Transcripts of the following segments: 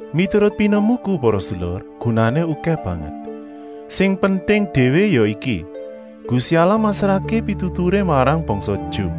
Miturut pinemuku para sedulur, gunané okèh banget. Sing penting déwé ya iki: Gusti Allah masrahké pituturé marang bangsa Ju.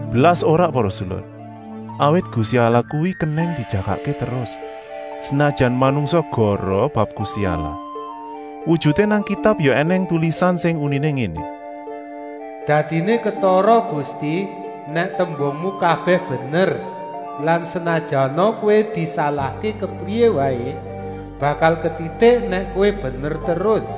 Blas ora para sedulur, awit Gusti Allah kuwi kenèng dijagakké terus, senajan manungsa goroh bab Gusti Allah. Wujuté nang Kitab ya ènèng tulisan sing uniné ngéné: “Dadiné ketara Gusti, nèk tembungmu kabèh bener lan senajana Kowé disalahké kepriyé waé, bakal ketitik nèk Kowé bener terus.”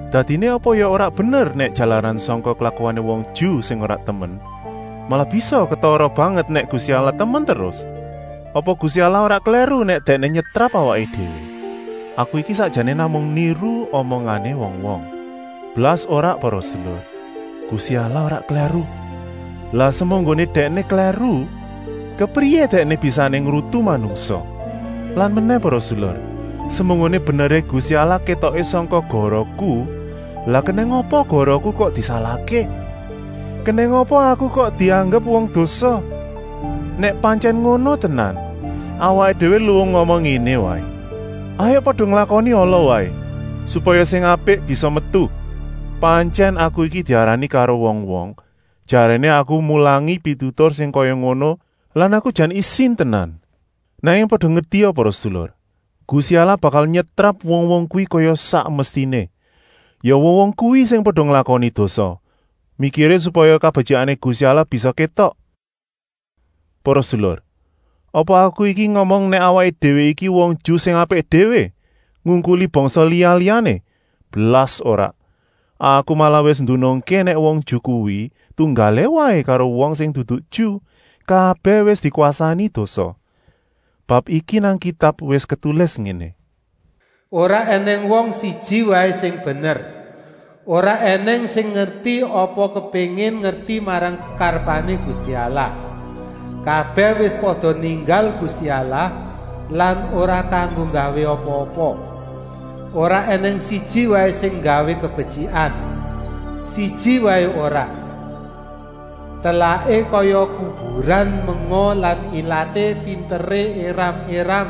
Dadiné apa ya ora bener nèk jalaran sangka klakuané wong Ju sing ora temen, malah bisa ketara banget nèk Gusti Allah temen terus? Apa Gusti Allah ora klèru nèk Dèkné nyetrap awaké déwé? (Aku iki sakjané namung niru omongané wong-wong.) Blas ora para sedulur, Gusti Allah ora klèru! Lah semunggoné Dèkné klèru, kepriyé Dèkné bisané ngrutu manungsa? Lan menèh para sedulur, semunggoné beneré Gusti Allah kétoké sangka gorohku, lah kenèng apa gorohku kok disalahké? Kenèng apa aku kok dianggep wong dosa? Nèk pantyèn ngono tenan, awaké déwé luwung ngomong ngéné waé: “Hayuk pada nglakoni ala waé, supaya sing apik bisa metu.” Pantyèn aku iki diarani karo wong-wong, jaréné aku mulangi pitutur sing kaya ngono lan aku jan isin tenan. Nanging pada ngertia para sedulur, Gusti Allah bakal nyetrap wong-wong kuwi kaya sak mestiné, ya wong-wong kuwi sing pada nglakoni dosa, mikiré supaya kabetyikané Gusti Allah bisa kétok. Para sedulur, apa aku iki ngomong nèk awaké déwé iki wong Ju sing apik déwé, ngungkuli bangsa liya-liyané? Blas ora! Aku malah wis ndunungké nèk wong Ju kuwi tunggalé waé karo wong sing dudu Ju, kabèh wis dikwasani dosa. Bab iki nang Kitab wis ketulis ngéné: “Ora ènèng wong siji waé sing bener. Ora ènèng sing ngerti apa kepéngin ngerti marang kekarepané Gusti Allah. Kabèh wis pada ninggal Gusti Allah lan ora kanggo gawé apa-apa. Ora ènèng siji waé sing nggawé kabetyikan. Siji waé ora. Telaké kaya kuburan menga lan ilaté pinteré éram-éram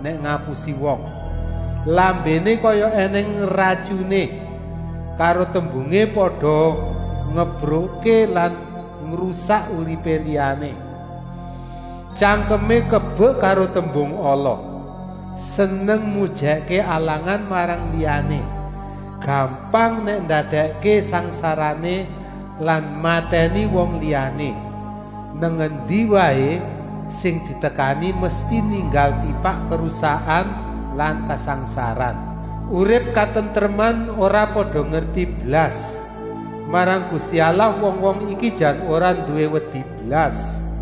nèk ngapusi wong. Lambéné kaya ènèng ratyuné, karo tembungé pada ngembrukké lan ngrusak uripé liyané. Tyangkemé kebek karo tembung ala, seneng mujèkké alangan marang liyané. Gampang nèk ndadèkké sangsarané lan matèni wong liyané. Nang endi waé sing ditekani mesti ninggal tipak karusakan lan kasangsaran. Urip katentreman ora pada ngerti blas. Marang Gusti Allah wong-wong iki jan ora nduwé wedi blas.”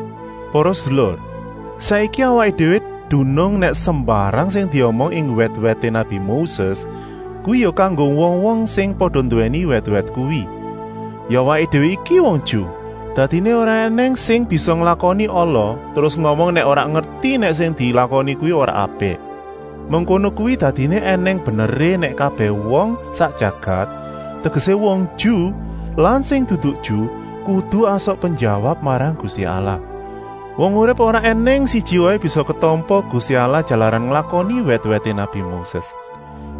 Para sedulur, saiki awaké déwé dunung nèk sembarang sing diomong ing wèt-wèté nabi Moses kuwi ya kanggo wong-wong sing pada nduwèni wèt-wèt kuwi, ya awaké déwé iki wong Ju. Dadiné ora ènèng sing bisa nglakoni ala terus ngomong nèk ora ngerti nèk sing dilakoni kuwi ora apik. Mengkono kuwi dadiné ènèng beneré nèk kabèh wong sak jagat, tegesé wong Ju lan sing dudu Ju, kudu asok penjawab marang Gusti Allah. Wong urip ora ènèng siji waé bisa ketampa Gusti Allah jalaran nglakoni wèt-wèté nabi Moses.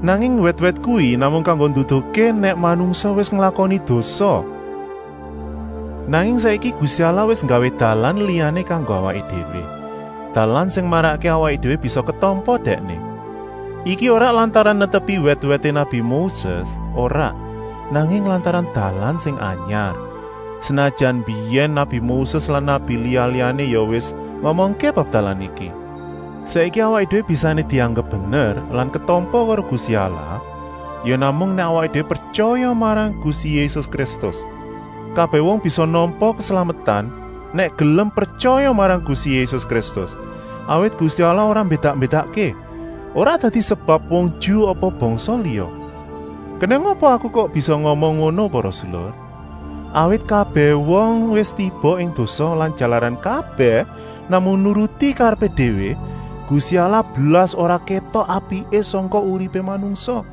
Nanging wèt-wèt kuwi namung kanggo nduduhké nèk manungsa wis nglakoni dosa. Nanging saiki Gusti Allah wis nggawé dalan liyané kanggo awaké déwé, dalan sing marakké awaké déwé bisa ketampa Dèkné. Iki ora lantaran netepi wèt-wèté nabi Moses, ora, nanging lantaran dalan sing anyar, senajan mbiyèn nabi Moses lan nabi liya-liyané ya wis ngomongké bab dalan iki. Saiki awaké déwé bisané dianggep bener lan ketampa karo Gusti Allah ya namung nèk awaké déwé pretyaya marang Gusti Yésus Kristus. Kabèh wong bisa nampa keslametan, nèk gelem pretyaya marang Gusti Yésus Kristus, awit Gusti Allah ora mbédak-mbédakké, ora dadi sebab wong Ju apa bangsa liya. Kenèng apa aku kok bisa ngomong ngono para sedulur. Awit kabèh wong wis tiba ing dosa lan jalaran kabèh namung nuruti karepé déwé, Gusti Allah blas ora kétok apiké sangka uripé manungsa.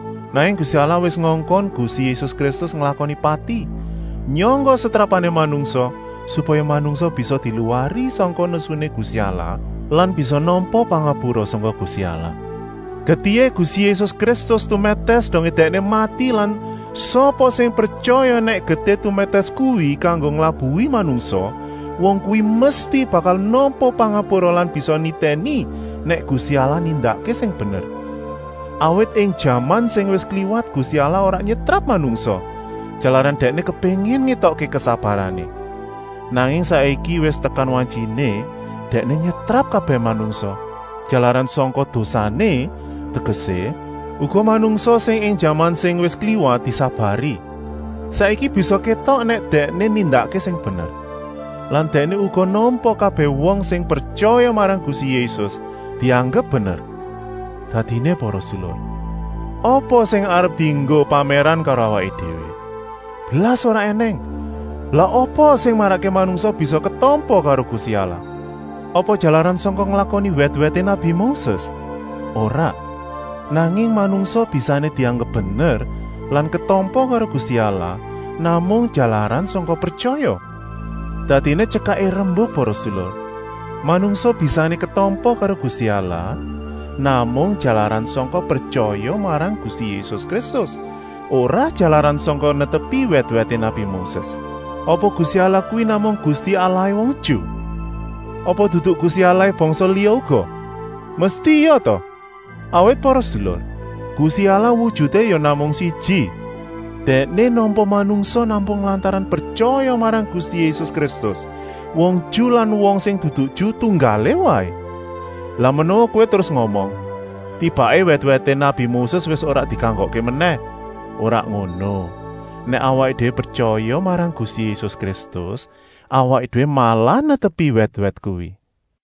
Nanging Gusti Allah wis ngongkon Gusti Yésus Kristus nglakoni pati, nyangga setrapané manungsa, supaya manungsa bisa diluwari sangka nesuné Gusti Allah lan bisa nampa pangapura sangka Gusti Allah. Getihé Gusti Yésus Kristus tumètès dongé Dèkné mati lan sapa sing pretyaya nèk getih tumètès kuwi kanggo nglabuhi manungsa, wong kuwi mesti bakal nampa pangapura lan bisa nitèni nèk Gusti Allah nindakké sing bener. Awit ing jaman sing wis kliwat Gusti Allah ora nyetrap manungsa, jalaran Dèkné kepéngin ngétokké kesabarané. Nanging saiki wis tekan wantyiné Dèkné nyetrap kabèh manungsa, jalaran sangka dosané, tegesé, uga manungsa sing ing jaman sing wis kliwat disabari. Saiki bisa kétok nèk Dèkné nindakké sing bener. Lan Dèkné uga nampa kabèh wong sing pretyaya marang Gusti Yésus, dianggep bener. Dadiné para sedulur, apa sing arep dienggo pamèran karo awaké déwé? Blas ora ènèng. Lah apa sing marakké manungsa bisa ketampa karo Gusti Allah? Apa jalaran sangka nglakoni wèt-wèté nabi Moses? Ora, nanging manungsa bisané dianggep bener lan ketampa karo Gusti Allah namung jalaran sangka pretyaya. Dadiné tyekaké rembuk para sedulur, manungsa bisané ketampa karo Gusti Allah namung jalaran sangka pretyaya marang Gusti Yésus Kristus, ora jalaran sangka netepi wèt-wèté nabi Moses. Apa Gusti Allah kuwi namung Gusti Allahé wong Ju? Apa dudu Gusti Allahé bangsa liya uga? Mesti ya ta! Awit para sedulur, Gusti Allah wujuté ya namung siji. Dèkné nampa manungsa namung lantaran pretyaya marang Gusti Yésus Kristus, wong Ju lan wong sing dudu Ju tunggalé waé. Lah menawa kowé terus ngomong: tibaké wèt-wèté nabi Moses wis ora dikanggokké menèh? Ora ngono. Nèk awaké déwé pretyaya marang Gusti Yésus Kristus, awaké déwé malah netepi wèt-wèt kuwi.